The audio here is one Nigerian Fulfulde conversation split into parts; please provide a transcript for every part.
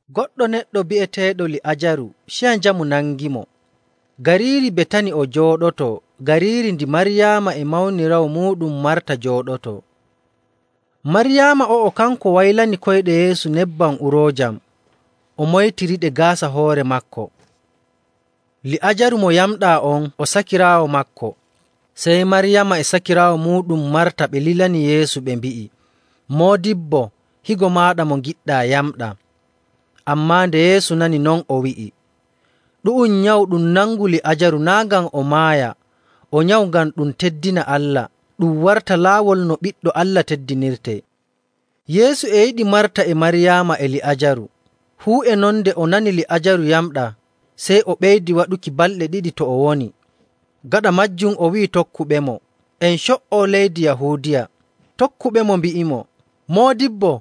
Goɗɗo neɗɗo bi'eteeɗo Li'aajaru ciya njamu nangimo. Gariiri Betani o jooɗotoo, gariiri ndi Maryaama e mawniraawo muuɗum Marta njooɗotoo.. Maryaama o'o, kanko waylani koyɗe Yeesu nebbam uroojam o moytiriɗe gaasa hoore maako. Li'aajaru mo yamɗaa on, o sakiraawo maako.. Sey Maryaama e sakiraawo muuɗum Marta ɓe lilani Yeesu ɓe mbi'i, “Moodibbo, higo maaɗa mo ngiɗɗaa yamɗaa.” Ammaa nde Yeesu nani non, o wi'i, “Ɗu'um nyawu ɗum nangu Li'aajaru naa' ngam o maaya, o nyawu ngam ɗum teddina Allah, ɗum warta laawol no Ɓiɗɗo Allah teddinirtee.” Yeesu e yiɗi Marta e Maryaama e Li'aajaru. Fuu e non nde o nani Li'aajaru yamɗaa, sey o ɓeydi waɗuki balɗe ɗiɗi to o woni. Gaɗa maajum o wi'i tokkuɓemo, “En co''o leydi Yahuudiya.” Tokkuɓemo mbi'imo, “Moodibbo,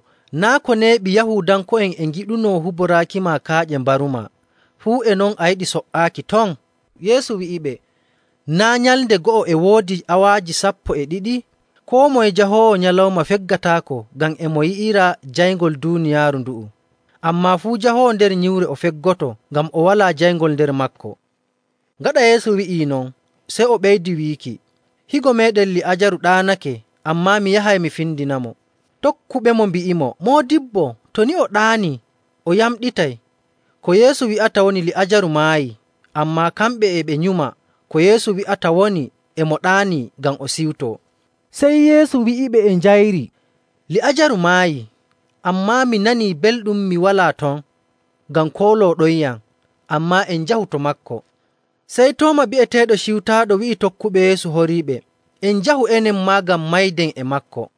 naa' ko neeɓi Yahuudanko'en e ngiɗunoo huboraakima kaaƴe mbarumaa, fuu e non a yiɗi so''aaki ton?” Yeesu wi'iɓe, “Naa' nyalnde go'o e woodi awaaji sappo e ɗiɗi? Koo moye jahoowo nyalawma feggataako ngam e mo yi'ira jayngol duuniyaaru ndu'u. Ammaa fuu jahoowo nder nyiwre o feggoto, ngam o walaa jayngol nder maako.” Gaɗa Yeesu wi'ii non, sey o ɓeydi wiiki, “Higo meeɗen Li'aajaru ɗaanake, ammaa mi yahay mi findinamo.” Tokkuɓemo mbi'imo, “Moodibbo, to ni o ɗaani, o yamɗitay.” Ko Yeesu wi'ata woni Li'aajaru maayii, ammaa kamɓe e ɓe nyuma ko Yeesu wi'ata woni e mo ɗaanii ngam o siwtoo. Sey Yeesu wi'iɓe e njayri, “Li'aajaru maayii. Ammaa mi nanii belɗum mi walaa ton, ngam koolooɗonyam. Ammaa en njahu to maako.” Sey Tooma bi'eteeɗo Ciwtaaɗo wi'i tokkuɓe Yeesu horiiɓe, “En njahu enen maa ngam mayden e maako.”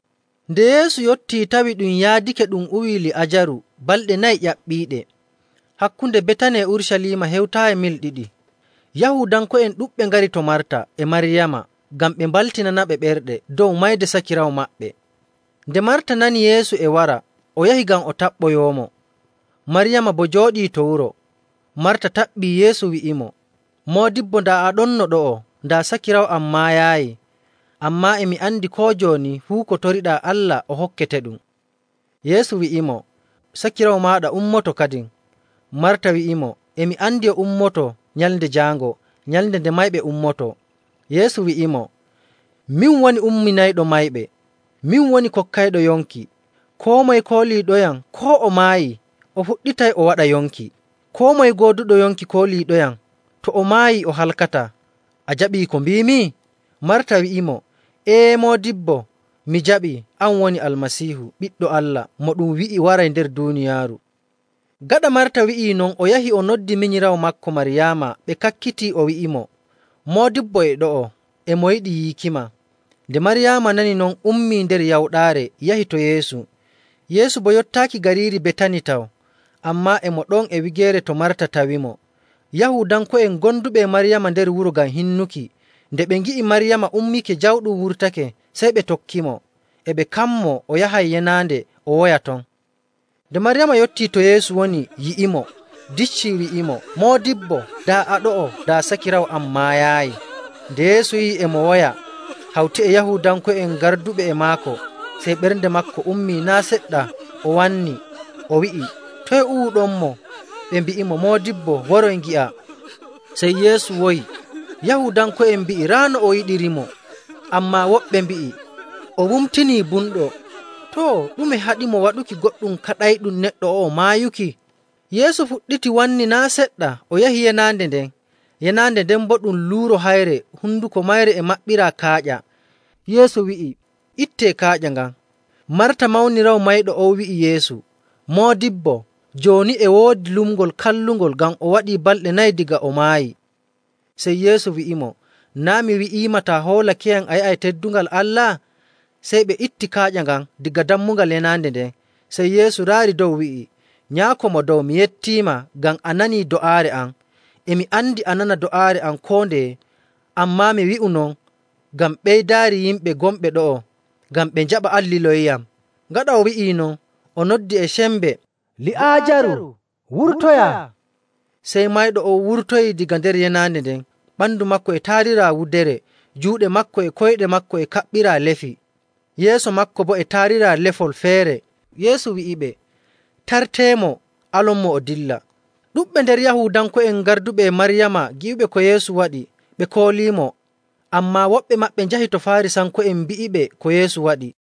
Nde Yeesu yottii tawi ɗum yaadake ɗum uwii Li'aajaru balɗe nayi ƴaɓɓiiɗe. Hakkunde Betani e Urucaliima hewtaayi mil ɗiɗi. Yahuudanko'en ɗuɗɓe ngari to Marta e Maryaama ngam ɓe mbaltinanaɓe ɓerɗe dow mayde sakiraawo maɓɓe. Nde Marta nani Yeesu e wara, o yahi ngam o taɓɓoyoomo, Maryaama boo jooɗii to wuro. Marta taɓɓii Yeesu wi'imo, “Moodibbo, daa a ɗonno ɗo'o, daa sakiraawo am maayaayi. Ammaa e mi andi koo jooni fuu ko toriɗaa Allah o hokketeɗum.” Yeesu wi'imo, “Sakiraawo maaɗa ummoto kadin.” Marta wi'imo, “E mi andi o ummoto Nyalnde Jaango nyalnde nde mayɓe ummotoo.” Yeesu wi'imo, “Min woni umminayɗo mayɓe, min woni kokkayɗo yonki. Koo moye kooliiɗoyam, koo o maayii, o fuɗɗitay o waɗa yonki. Koo moye gooduɗo yonki kooliiɗoyam, to o maayii o halkataa. A jaɓii ko mbiimi?” Marta wi'imo, “Ee, Moodibbo, mi jaɓii an woni Almasiihu, Ɓiɗɗo Allah, mo ɗum wi'i waray nder duuniyaaru.” Gaɗa Marta wi'ii non, o yahi o noddi minyiraawo maako Maryaama ɓe kakkiti o wi'imo, “Moodibbo e ɗo'o e mo yiɗi yiikima.” Nde Maryaama nani non, ummii nder yawɗaare yahi to Yeesu. Yeesu boo yottaaki gariiri Betani taw, ammaa e mo ɗon e wigeere to Marta tawimo. Yahuudanko'en gonduɓe e Maryaama nder wuro ngam hinnuki, nde ɓe ngi'i Maryaama ummake jawɗum wurtake, sey ɓe tokkimo, e ɓe kammoo o yahay yenaande o woya ton. Nde Maryaama yottii to Yeesu woni yi'imo, dicci, wi'imo, “Moodibbo, daa a ɗo'o, daa sakiraawo am maayaayi.” Nde Yeesu yi'i e mo woya hawti e Yahuudanko'en garduɓe e maako, sey ɓernde maako ummii naa' seɗɗa o wannii. O wi'i, “Toye uwuɗonmo?” Ɓe mbi'imo, “Moodibbo, woroy, ngi'a.” Sey Yeesu woyi. Yahuudanko'en ɓen mbi'i, “Raa no o yiɗirimo!” Ammaa woɓɓe mbi'i, “O wumtinii bumɗo. Too, ɗume haɗimo waɗuki goɗɗum kaɗayɗum neɗɗo o'o maayuki?” Yeesu fuɗɗiti wanni naa' seɗɗa, o yahi yenaande nden. Yenaande nden boo ɗum luuro hayre, honduko mayre e maɓɓiraa kaaƴa. Yeesu wi'i, “Ittee kaaƴa ngan.” Marta mawniraawo mayɗo on wi'i Yeesu, “Moodibbo, jooni e woodi lumngol kallungol, ngam o waɗii balɗe nayi daga o maayi.” Sey Yeesu wi'imo, “Naa' mi wi'iima taa hoolakeyam, a yi'ay teddungal Allah?” Sey ɓe itti kaaƴa ngan daga dammugal yenaande nden. Sey Yeesu raari dow wi'i, “Nyaako Mo Dow, mi yettiima ngam a nanii do'aare am. E mi andi a nana do'aare am koo ndeye, ammaa mi wi'u non ngam ɓeydaari yimɓe gonɓe ɗo'o, ngam ɓe njaɓa an liloyiyam.” Gaɗa o wi'ii non, o noddi e sembe, “Li'aajaru, wurtoya!” Sey mayɗo on wurtoyii daga nder yenaande nden, ɓandu maako e taariraa wudere, juuɗe maako e koyɗe maako e kaɓɓiraa lefi, yeeso maako boo e taariraa lefol feere. Yeesu wi'iɓe, “Taarteemo, alonmo o dilla.” Ɗuɗɓe nder Yahuudanko'en garduɓe e Maryaama gi'uɓe ko Yeesu waɗi, ɓe kooliimo. Ammaa woɓɓe maɓɓe njahi to Faarisanko'en mbi'iɓe ko Yeesu waɗi.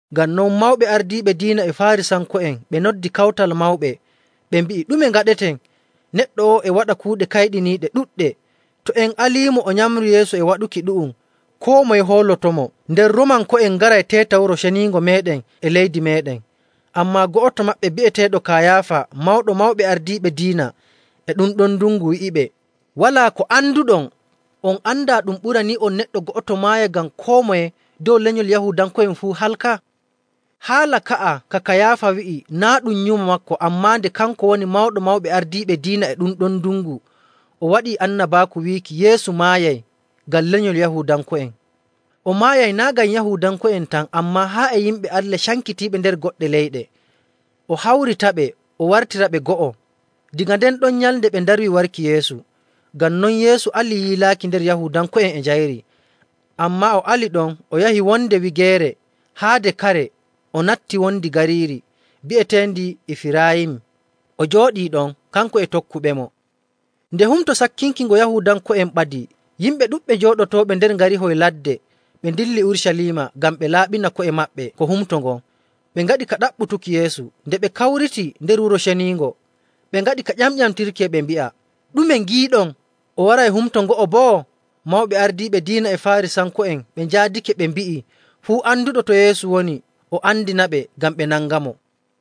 Ngam non, mawɓe ardiiɓe diina e Faarisanko'en ɓe noddi kawtal mawɓe, ɓe mbi'i, “Ɗume ngaɗeten? Neɗɗo o'o e waɗa kuuɗe kayɗiniiɗe ɗuɗɗe. To en aliimo o nyamrii yeeso e waɗuki ɗu'um, koo moye hoolotomo, nden Roomanko'en ngaray teeta Wuro Ceniingo meeɗen e leydi meeɗen.” Ammaa go'oto maɓɓe bi'eteeɗo Kayaafa Mawɗo Mawɓe Ardiiɓe Diina e ɗum ɗon ndungu wi'iɓe, “Walaa ko anduɗon! On andaa ɗum ɓuranii'on neɗɗo go'oto maaya ngam koo moye dow lenyol Yahuudanko'en fuu halka.” Haala ka'a ka Kayaafa wi'i naa' ɗum nyumo maako, ammaa nde kanko woni Mawɗo Mawɓe Ardiiɓe Diina e ɗum ɗon ndungu o waɗi annabaaku wiiki Yeesu maayay ngam lenyol Yahuudanko'en. O maayay naa' ngam Yahuudanko'en tan, ammaa haa e yimɓe Allah cankitiiɓe nder goɗɗe leyɗe, o hawritaɓe o wartiraɓe go'o. Daga nden ɗon nyalnde ɓe ndarwi warki Yeesu. Ngam non Yeesu ali yiilaaki nder Yahuudanko'en e njayri. Ammaa o ali ɗon o yahi wonde wigeere haade kare o natti wondi gariiri bi'eteendi Ifiraayim, o jooɗii ɗon, kanko e tokkuɓemo. Nde Humto Sakkinki ngo Yahuudanko'en ɓadii, yimɓe ɗuɗɓe jooɗotooɓe nder ngarihoy ladde ɓe ndilli Urucaliima ngam ɓe laaɓina ko'e maɓɓe ko humto ngon. Ɓe ngaɗi ka ɗaɓɓutuki Yeesu. Nde ɓe kawriti nder Wuro Ceniingo, ɓe ngaɗi ka ƴamƴamtirki e ɓe mbi'a, “Ɗume ngiiɗon? O waray humto ngo'o boo?” Mawɓe ardiiɓe diina e Faarisanko'en ɓe njaadake ɓe mbi'ii fuu anduɗo to Yeesu woni, o andinaɓe ngam ɓe nangamo.